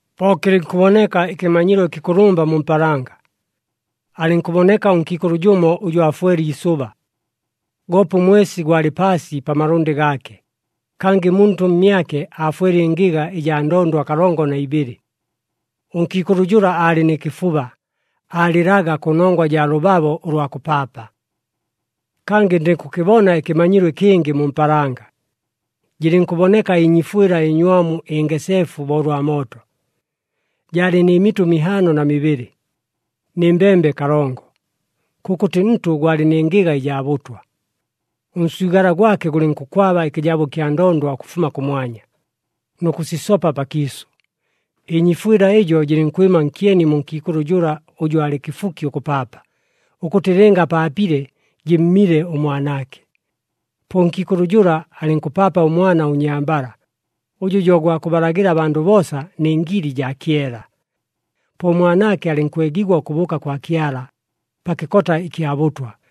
Po kɨlɨnkʉboneka ɨkɨmanyilo ɨkɨkʉlʉmba mu mpaalanga. Alɨnkʉboneka ʉnkiikʉlʉ jʉmo ʉjʉ aafwele iisʉba. Goope ʉmwesi gwalɨ paasi pa malʉndɨ gaake, kangɨ muntʉ mmyake aafwele ɨngɨga ɨjaa ndondwa kalongo na ibɨlɨ. Ʉnkiikʉlʉ jʉla aalɨ nɨ kɨfuba, aalɨlaga kʉnongwa jaa lʉbabo ʉlwa kʉpaapa. Kangɨ ndɨnkʉkɨbona ɨkɨmanyilo ɨkɨngɨ mu mpaalanga. Jɨlɨnkʉboneka ɨnyiifwɨla ɨnywamu ɨngeseefu bo ʉlwa mooto. Jaalɨ nɨ mitʉ mihaano na mibɨlɨ, nɨ mbembe kalongo. Kʉkʉtɨ ntʉ gwalɨ nɨ ngɨga ɨjaa bʉtwa. Ʉnswigala gwake gʉlɨnkʉkwaba ɨkɨjabo ɨkya ndondwa ʉkʉfuma kʉmwanya, nʉ kʉsisopa pakiisʉ. Ɨnyiifwɨla ɨjo jɨlɨnkwɨma nkyeni mu nkiikʉlʉ jʉla ʉjʉ alɨ kɨfuki ʉkʉpaapa, ʉkʉtɨ lɨnga apaapile, jɨmmile ʉmwanaake. Po ʉnkiikʉlʉ jʉla alɨnkʉpaapa ʉmwana ʉnnyambala, ʉjʉ jo gwa kʉbalagɨla abandʉ boosa nɨ ngili jaa kyela. Po ʉmwanaake alɨnkwegigwa ʉkʉbʉʉka kwa Kyala, pa kɨkota ɨkya bʉtwa.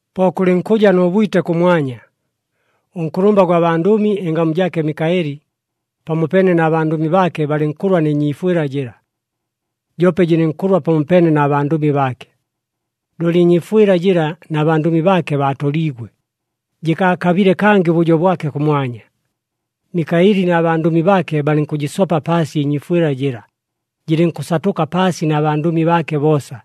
Po kʉlɨnkʉja nʉ bwite kʉmwanya. Ʉnkʉlʉmba gwa bandʉmi, ɨngamu jaake Mikaɨli, pamopeene na bandʉmi baake balɨnkʉlwa nɨ nyiifwɨla jɨla. Joope jɨlɨnkʉlwa pamopeene na bandʉmi baake. Looli ɨnyiifwɨla jɨla na bandʉmi baake baatoliigwe, jɨkaakabile kangɨ ʉbʉjo bwake kʉmwanya. Mikaɨli na bandʉmi baake balɨnkʉjɨsopa paasi ɨnyiifwɨla jɨla, jɨlɨnkʉsatʉka paasi na bandʉmi baake boosa.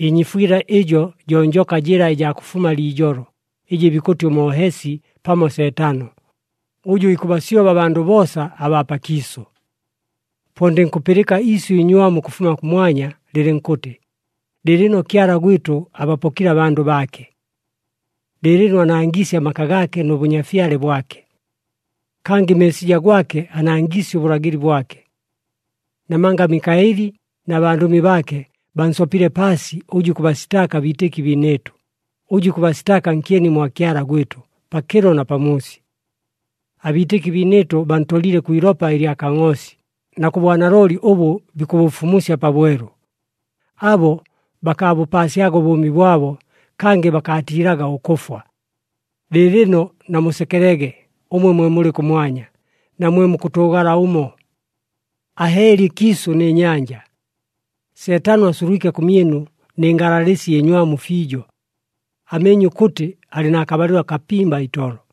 Ɨnyiifwɨla ɨjo jo njoka jɨla ɨjaa kʉfuma liijolo, ɨjɨ bikʉtɨ ʉMoohesi pamo Seetano, ʉjʉ ikʉbasyoba abandʉ boosa abaa pakiisʉ. Po ndɨnkʉpɨlɨka iisyʉ iinywamu ʉkʉfuma kʉmwanya lɨlɨnkʉtɨ, “Lɨɨlɨno Kyala gwɨtʉ abapokile abandʉ baake! Lɨɨlɨno anangiisye amaka gaake nʉ Bʉnyafyale bwake! Kangɨ Meesija gwake anangiisye ʉbʉlagɨli bwake! Namanga Mikaɨli na bandʉmi baake, bansopile paasi ʉjʉ ikʉbasitaaka abiitɨki biinɨɨtʉ, ʉjʉ ikʉbasitaaka nkyeni mwa Kyala gwɨtʉ, pakɨlo na pamuusi. Abiitɨki biinɨɨtʉ bantolile kwi ilopa ɨlya Kangʼoosi, na kʉ bwanalooli ʉbʉ bikʉbʉfumusya pabwelu. Abo bakaabʉpaasyaga ʉbʉʉmi bwabo, kangɨ bakaatiilaga ʉkʉfwa. Lɨɨlɨno namusekelege, ʉmwe mwe mulɨ kʉmwanya, na mwe mukʉtʉʉgala ʉmo! Ahɨɨli ɨkiisʉ nɨ nyanja! Seetano asulwike kʉmyɨnu nɨ ngalalɨsi ɨnywamu fiijo! Ameenye ʉkʉtɨ alɨ na kabalɨlo kapimba itolo.”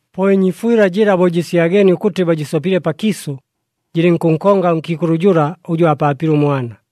Po ɨnyiifwɨla jɨla bo jɨsyageenie ʉkʉtɨ bajɨsopile pakiisʉ, jɨlɨnkʉnkonga ʉnkiikʉlʉ jʉla ʉjʉ aapaapile ʉmwana.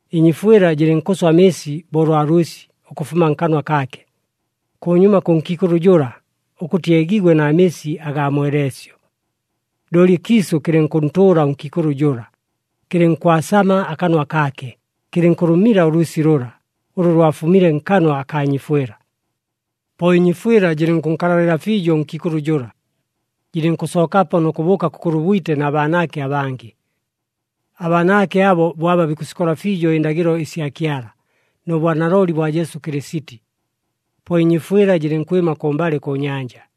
Ɨnyiifwɨla jɨlɨnkʉswa amɨɨsi bo ʉlwa lwɨsi ʉkʉfuma nkanwa kaake, kʉnyuma kʉ nkiikʉlʉ jʉla, ʉkʉtɨ eegigwe na mɨɨsi agaa mweleesyo. Looli ɨkiisʉ kɨlɨnkʉntʉʉla ʉnkiikʉlʉ jʉla, kɨlɨnkwasama akanwa kaake, kɨlɨnkʉlʉmila ʉlwɨsi lʉla, ʉlʉ lwafumile nkanwa akaa nyiifwɨla. Po ɨnyiifwɨla jɨlɨnkʉnkalalɨla fiijo ʉnkiikʉlʉ jʉla, jɨlɨnkʉsookapo nʉ kʉbʉʉka kʉkʉlwa ʉbwite na baanaake abangɨ. Abaanaake abo bo aba bikʉsikola fiijo ɨndagɨlo ɨsya Kyala, nʉ bwanalooli bwa Jesu Kɨlɨsiti. Po ɨnyiifwɨla jɨlɨnkwɨma kʉmbalɨ kʉ nyanja.